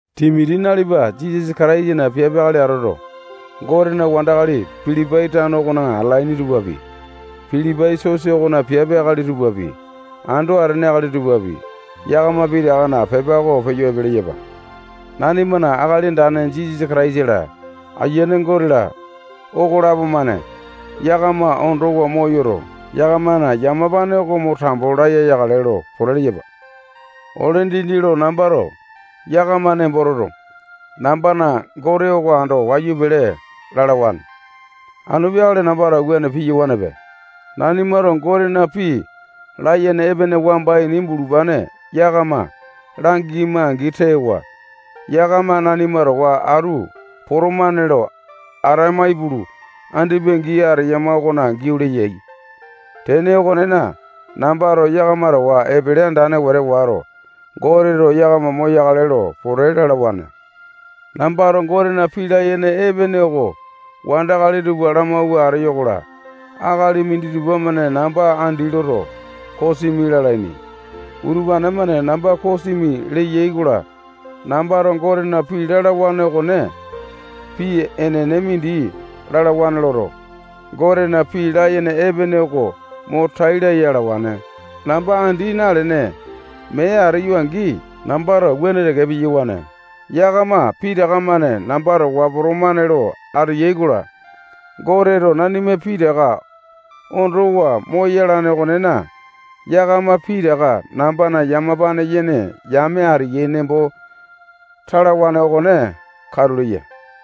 Timoti, nalipa Jisasa Kataisana piape akali atoto, Gotena wandakali Pilipai tano okona atalaini tupapi, Pilipai sosa okona piape akali tupapi, ando atene akali tupapi, yakama pitakana pepa oko peyo epe leyapa. Nanimana Akali Andane Jisasa Kataisa-la, Ayiane Gote-la, okolapo-mane yakama ondowa moyoto, yakamana yamapane oko mo tambo laya yakale lo pote leyapa. Ole dindi lo nambato yakama nembo toto, nambana Gote oko ando wayu pele lalawane. Anu peakale nambato wuane piyawanepe. Nanimato Gotena pii layene epene wamba ini bulupane yakama langema-angi tewa, yakama nanima towa atu potomane lo atama ipulu, andipa gii ateyama okona giau leyai. Tene okonena, nambato yakama towa epele andane wete wato, Goteto yakama moyakale lo pote lalawane. Nambato Gotena pii layene epene oko wandakali tupa lamawua ateyo-kola, akali minditupa-mane namba andi loto, kosimi lalaini. Utupane-mane namba kosimi leyai-kola, nambato Gotena pii lalawane okone pii enene mindi lalawane loto, Gotena pii layene epene oko mo tai laya alawane. Namba andi nalene, mee ateyo-angi, nambato wuane teke piyawane. Yakama pitaka-mane namba towa potomane lo ateyai-kola, Goteto nanima pitaka ondowa moyalane okonena, yakama pitaka nambana yamapane yene yame ateyai nembo talawane okone katu leya.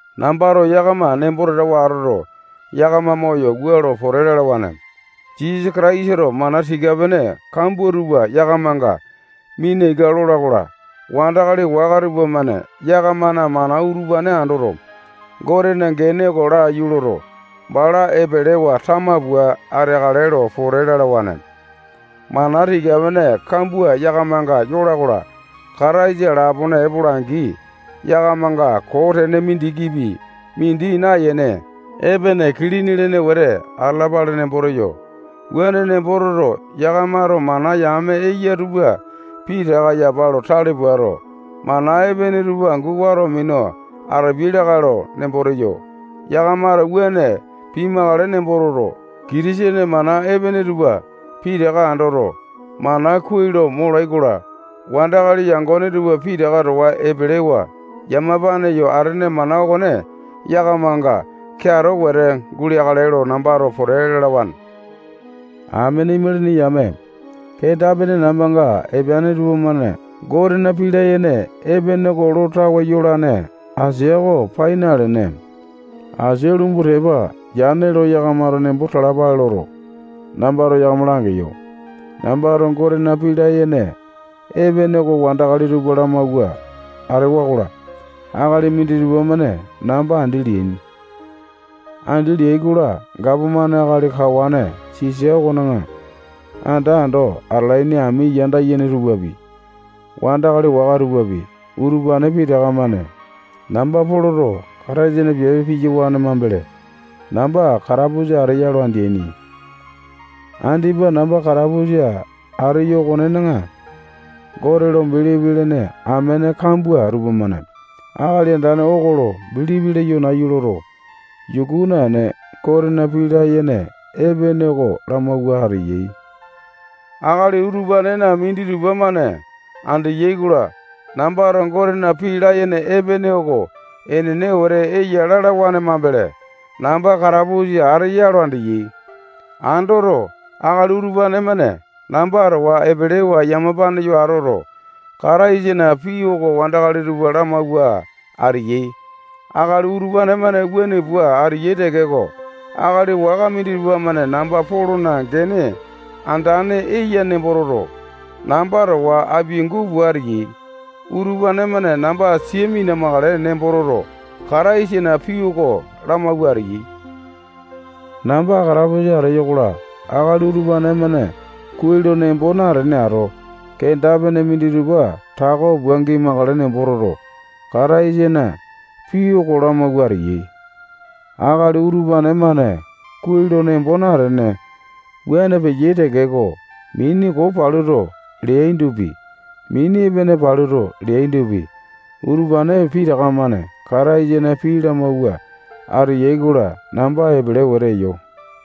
Nambato yakama nembo tatawa atoto, yakama moyo wua lo pote lalawane: Jisasa Kataisato mana tika-pene kambua tupa yakamanga mina ika lola-kola, wandakali waka tupamane yakamana mana utupane andoto, Gotena gene oko laiyu loto, bala epelewa tama pua ateakale lo pote lalawane. Mana tika-pene kambua yakamanga yola-kola, Kataisa lapone epola-angi, yakamanga koo tene mindikipi mindi nayene, epene kilini lene wete atalapale nembo teyo. Wuane nembo toto, yakamato mana yame eya tupa pitaka yapa lo tale puato, mana epene tupa angu wato minu atapiai lakae lo nembo teyo. Yakamato wuane pimakale nembo toto, Kitisene mana epene tupa pitaka andoto, mana kuai lo molai-kola, wandakali yangone tupa pitaka towa epelewa yamapane yo atene mana okone yakamanga keato wete guleakale lo nambato pote lalawane. Amene imalini yame, kenda-pene nambanga epeane tupamane Gotena pii layene epene oko lo tawe yolane asia oko pai nalene, asia lumbu tepa yane lo yakamato nembo talapale loto, nambato yakama langeyo. Nambato Gotena pii layene epene oko wandakali tupa lamawua atewa-kola, akali minditupa-mane namba andi leaini. Andi leai-kola, gapomane akali kawane Sisa okona anda ando atalaini ami yame tupapi, wandakali waka tupapi, utupane pitaka-mane namba Poloto Kataisana piape piyawane mambele, namba katapusa ateya lo andeaini. Andipa namba katapusa ateyo okonena, Gote lo bilipi lene amene kambua tupamane Akali Andane oko lo bilipi leyo nayu loto, yuku naene, Gotena pii layene epene oko lamawua ateyai. Akali utupanena minditupa-mane andeyai-kola, nambato Gotena pii layene epene oko enene wete eya lalawane mambele, namba katapusa ateya lo andeyai. Andoto, akali utupane-mane namba towa epelewa yamapane yo atoto, Kataisana pii oko wandakali tupa lamawua ateyai. Akali utupane-mane wuane pua ateyai tekeko, akali waka minditupa-mane namba Polona gene andane eya nembo toto, namba towa apiangu pua ateyai. Utupane-mane namba sia mina-makale nembo toto, Kataisana pii oko lamawua ateyai. Namba katapusa ateyo-kola, akali utupane-mane kuai lo nembo natene ato, kenda-pene minditupa tako pua gimakale nembo toto, Kataisana pii oko lamawua ateyai. Akali utupane-mane kuai lo nembo natene, wuane peyai tekeko, mini koo paluto leaindopi, mini epene paluto leaindopi, utupane pitaka-mane Kataisana pii lamawua ateyai-kola, namba epele wete eyo.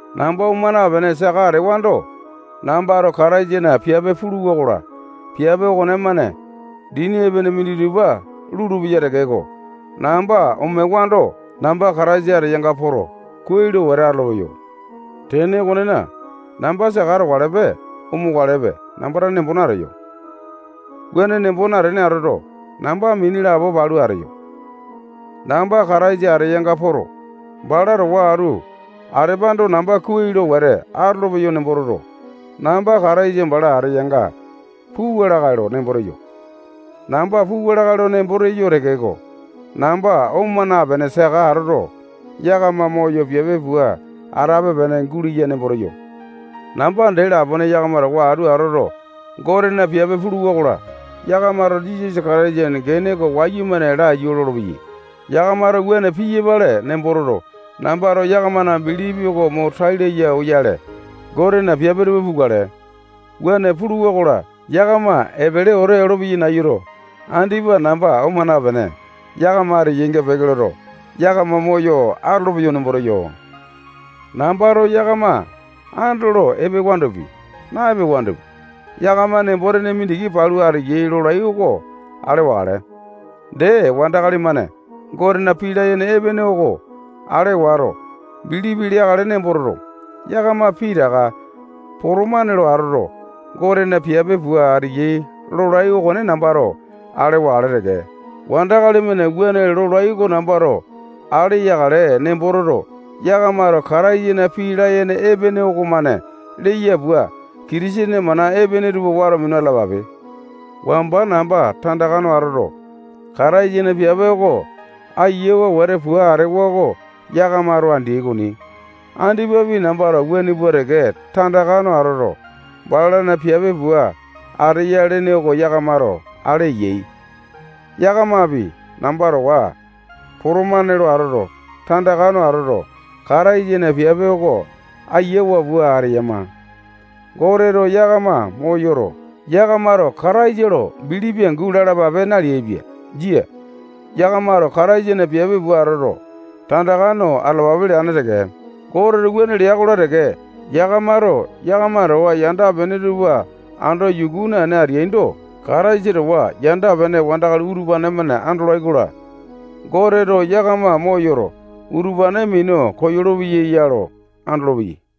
Namba oma napene, saka atewando, nambato Kataisana piape puluwa-kola, piape okonemane dini epene minditupa lulupeya tekeko, namba omewando, namba Kataisa ateyanga poto, kuai lo wete atolopeyo. Tene okonena, namba saka atokalepe, omokalepe namba tane nembo nateyo. Wuane nembo natene atoto, namba mini lapo palu ateyo. Namba Kataisa ateyanga poto, bala towa atu atepando, namba kuai lo wete atolopeyo nembo toto, namba Kataisa bala ateyanga puwa lakae lo nembo teyo. Namba puwa lakae lo nembo teyo tekeko, namba oma napene saka atoto, yakama moyo piape pua atape-pene guleya nembo teyo. Namba dee lapone yakama towa atu atoto, Gotena piape puluwa-kola, yakamato Jisasa Kataisana gene oko wayumane laiyu lolopeyai. Yakamato wuane piyapale nembo toto, nambato yakamana bilipi oko mo tai laya oyale, Gotena piape tupa pukale. Wuane puluwa-kola, yakama epele wete olopeyai nayuto, andipa namba oma napene, yakama ateyainga peke loto, yakama moyo atolopeyo nembo teyo. Nambato yakama andolo epewandopi, na-epewandopi, yakama nembo mindiki palu ateyai lolai oko ale wakale. Dee, wandakali-mane Gotena pii layene epene oko ale wato, bilipi leakale nembo toto, yakama pitaka potomane lo atoto, Gotena piape pua ateyai lolai okone nambato ale wakale teke. Wandakali-mane wuane lolai oko nambato ale yakale nembo toto, yakamato Kataisana pii layene epene okomane leya pua, Kitisene mana epene tupa wato minu atalapape. Wamba namba tandaka no atoto, Kataisana piape oko ayiawa wete pua atewa oko yakamato andeai okoni. Andipapi nambato wuane pua teke tandaka no atoto, balana piape pua ateya lene oko yakamato ale eyai. Yakamapi namba towa potomane lo atoto, tandaka no atoto, Kataisana piape oko ayiawa pua ateyama. Goteto yakama moyoto, yakamato Kataisa lo bilipi angu lalapape naleaipia. Jia. Yakamato Kataisana piape pua atoto, tandaka no atalapape leane teke. Goteto wuane lea-kola teke, yakamato yakama towa yanda-pene tupa ando yuku naene ateaindo, Kataisa towa yanda-pene wandakali utupane-mane andolai-kola, Goteto yakama moyoto, utupane minu koyolo-peya ya lo andolopeyai.